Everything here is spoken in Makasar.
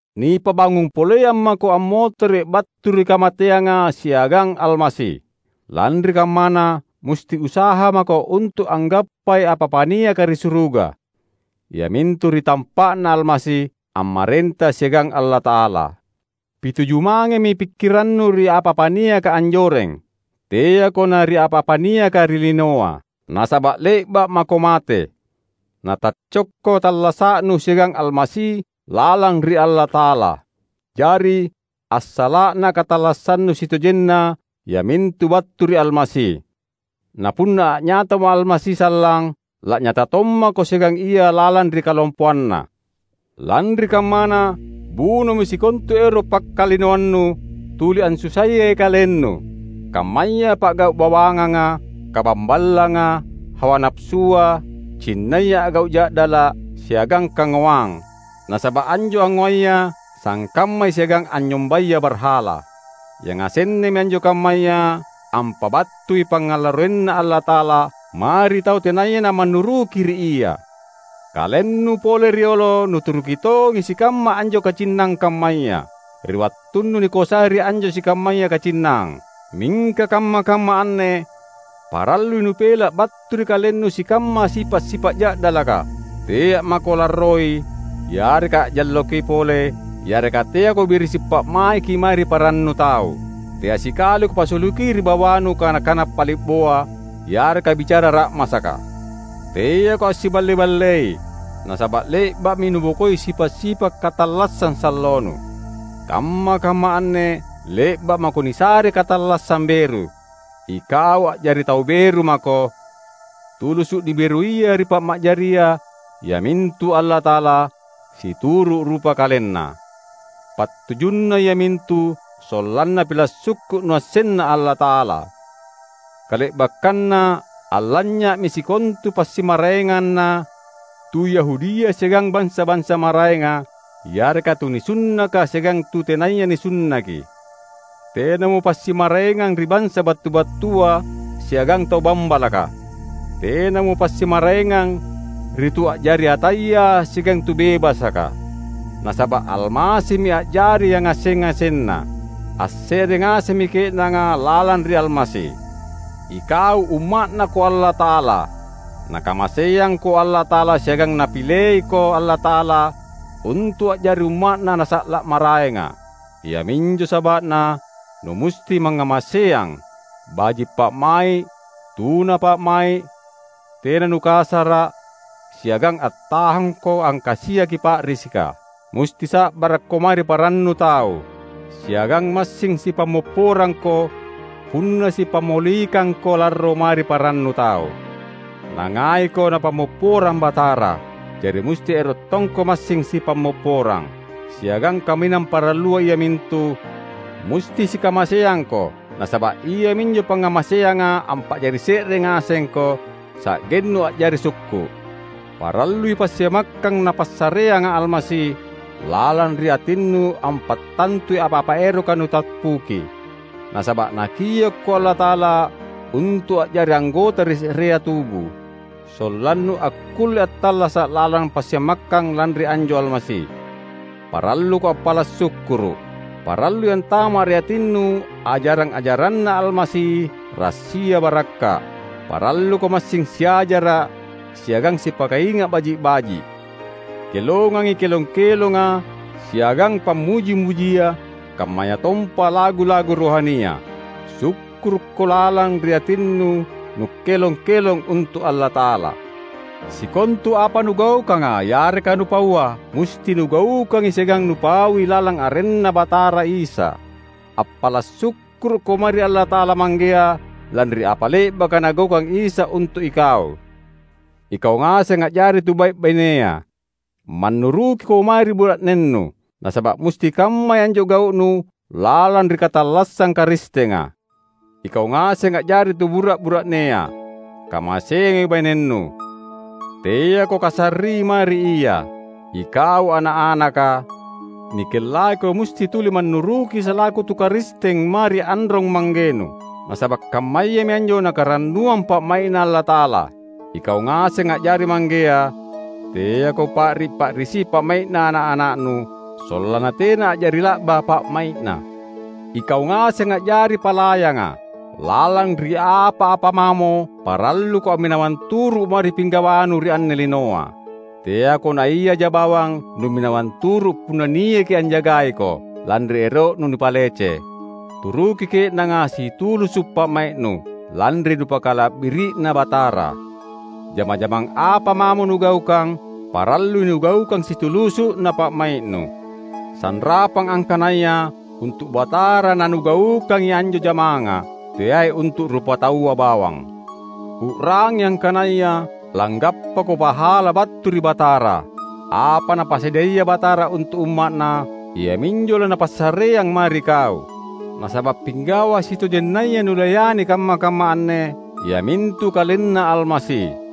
Nipabangung poleang mako ammotere’ battu ri kamateanga siagang Almasi. Lanri kammana, musti usaha mako untu’ anggappai apa-apa niaka ri suruga; iamintu ri tampa’Na Almasi, ammarenta siagang Allata’ala. Pituju mangemi pikkirannu ri apa-apa niaka anjoreng; teako na ri apa-apa niaka ri linoa. Nasaba’ le’ba’ mako mate, nataccokko tallasa’nu siagang Almasi lalang ri Allata’ala. Jari, assala’na katallassannu sitojenna iamintu battu ri Almasi; na punna a’nyatamo Almasi sallang, la’nyata tommako siagang Ia lalang ri kalompoanNa. Lanri kammana, bunomi sikontu ero’ pakkalinoannu, tuli ansusaiyai kalennu; kammaya pa’gau’ bawanganga, kabamballanga, hawa napasua, cinnaya a’gau’ ja’dala’, siagang kangoang (nasaba’ anjo angngoaya sangkammai siagang anynyombaya barhala). Yangasennami anjo kammaya ampabattui pangngalarroinNa Allata’ala mae ri tau tenaya namannuruki ri Ia. Kalennu pole riolo nuturuki tongi sikamma anjo kacinnang kammaya, ri wattunnu nikoasai ri anjo sikammaya kacinnang. Mingka kamma-kamma anne parallui nupela’ battu ri kalennu sikamma sipa’-sipa’ ja’dalaka. Tea’ mako larroi yareka a’jalloki pole yareka teako birisi’ pa’maiki mae ri parannu tau. Tea sikaliko pasuluki ri bawanu kana-kana pali’boa, yareka bicara ra’masaka. Teako assiballe-ballei, nasaba’ le’ba’mi nubokoi sipa’-sipa’ katallassang sallonu. Kamma-kamma anne le’ba’ mako nisare katallassang beru. Ikau a’jari tau beru mako, tulusu’ niberuia ri Mappa’jaria, iamintu Allata’ala, situru’ rupa KalenNa. Pattujunna iamintu sollanna pila’ sukku’ nuassenna Allata’ala. Kale’bakkanna allanynya’mi sikontu passimmaraenganna tu Yahudia siagang bansa-bansa maraenga, yareka tu nisunnaka siagang tu tenaya nisunnaki; tenamo passimmaraengang ri bansa battu-battua siagang tau bambalaka; tenamo passimmaraengang ri tu a’jari ataya siagang tu bebasaka; nasaba’ Almasimi a’jari yangaseng-ngasenna. Asse’re ngasemmi ke’nanga lalang ri Almasi! Ikau Umma’Nako Allata’ala. Nakamaseangko Allata’ala siagang Napileiko Allata’ala untu’ a’jari umma’Na nasa’la’ maraenga. Iaminjo saba’na numusti mangngamaseang, baji’ pa’mai’, tuna pa’mai’, tena nukasara’, siagang attahangko angkasiaki pa’risika. Musti sa’barakko mae ri parannu tau, siagang massing sipammopporangko punna sipammolikangko larro mae ri parannu tau. Nangaiko Napammopporang Batara; jari musti ero’ tongko massing sipammopporang. Siagang kaminang parallua iamintu: musti sikamaseangko nasaba’ iaminjo pangngamaseanga ampa’jari se’re ngasengko, sa’gennu a’jari sukku’. Parallui passiamakkang Napassareanga Almasi lalang ri atinnu ampattantui apa-apa eroka nutappuki. Nasaba’ Nakiokko Allata’ala untu’ a’jari anggota ri se’rea tubu, sollannu akkulle attallasa’ lalang passiamakkang lanri anjo Almasi. Paralluko appala’ sukkuru’. Parallui antama’ ri atinnu ajarang-ajaranNa Almasi rassia barakka’. Paralluko massing siajara’ siagang sipakainga’ baji’-baji’. Kelongangi kelong-kelonga siagang pammuji-mujia kammayatompa lagu-lagu rohania; sukkurukko lalang ri atinnu nukkelong-kelong untu’ Allata’ala. Sikontu apa nugaukanga yareka nupaua, musti nugaukangi siagang nupaui lalang arenNa Batara Isa. Appala’ sukkurukko mae ri Allata’ala Manggea lanri apa le’baka Nagaukang Isa untu’ ikau. Ikau ngaseng a’jari tu bai’-bainea! Mannurukiko mae ri bura’nennu, nasaba’ musti kammai anjo gau’nu lalang ri katallassang Karistenga. Ikau ngaseng a’jari tubura’-bura’nea! Kamaseangi bainennu. Teako kasarri mae ri ia. Ikau ana’-anaka! Nikellaiko musti tuli mannuruki salaku tu Karisteng mae ri anrong-manggenu, nasaba’ kammayami anjo Nakarannuang pa’mai’Na Allata’ala. Ikau ngaseng a’jari manggea! Teako pa’ri’-pa’risi pa’mai’na ana’-ana’nu, sollanna tena a’jari la’ba pa’mai’na. Ikau ngaseng a’jari palayanga! Lalang ri apa-apa mamo, paralluko amminawang turu’ mae ri pinggawanu ri anne linoa. Teako naiaja bawang numminawang turu’ punna niaki anjagaiko, lanri ero’nu nipalece. Turuki ke’nanga situlusu’ pa’mai’nu, lanri nupakala’biri’na Batara. Jama-jamang apa mamo nugaukang, parallui nugaukang situlusu’na pa’mai’nu; sanrapang angkanaya untu’ Batara nanugaukangi anjo jamanga, teai untu’ rupataua bawang. U’rangi angkanaya langgappako pahala battu ri Batara. Apa Napasadiaya Batara untu’ umma’Na, iaminjo laNapassareang mae ri kau. Nasaba’ pinggawa sitojennaya nulayani kamma-kamma anne, iamintu KalenNa Almasi.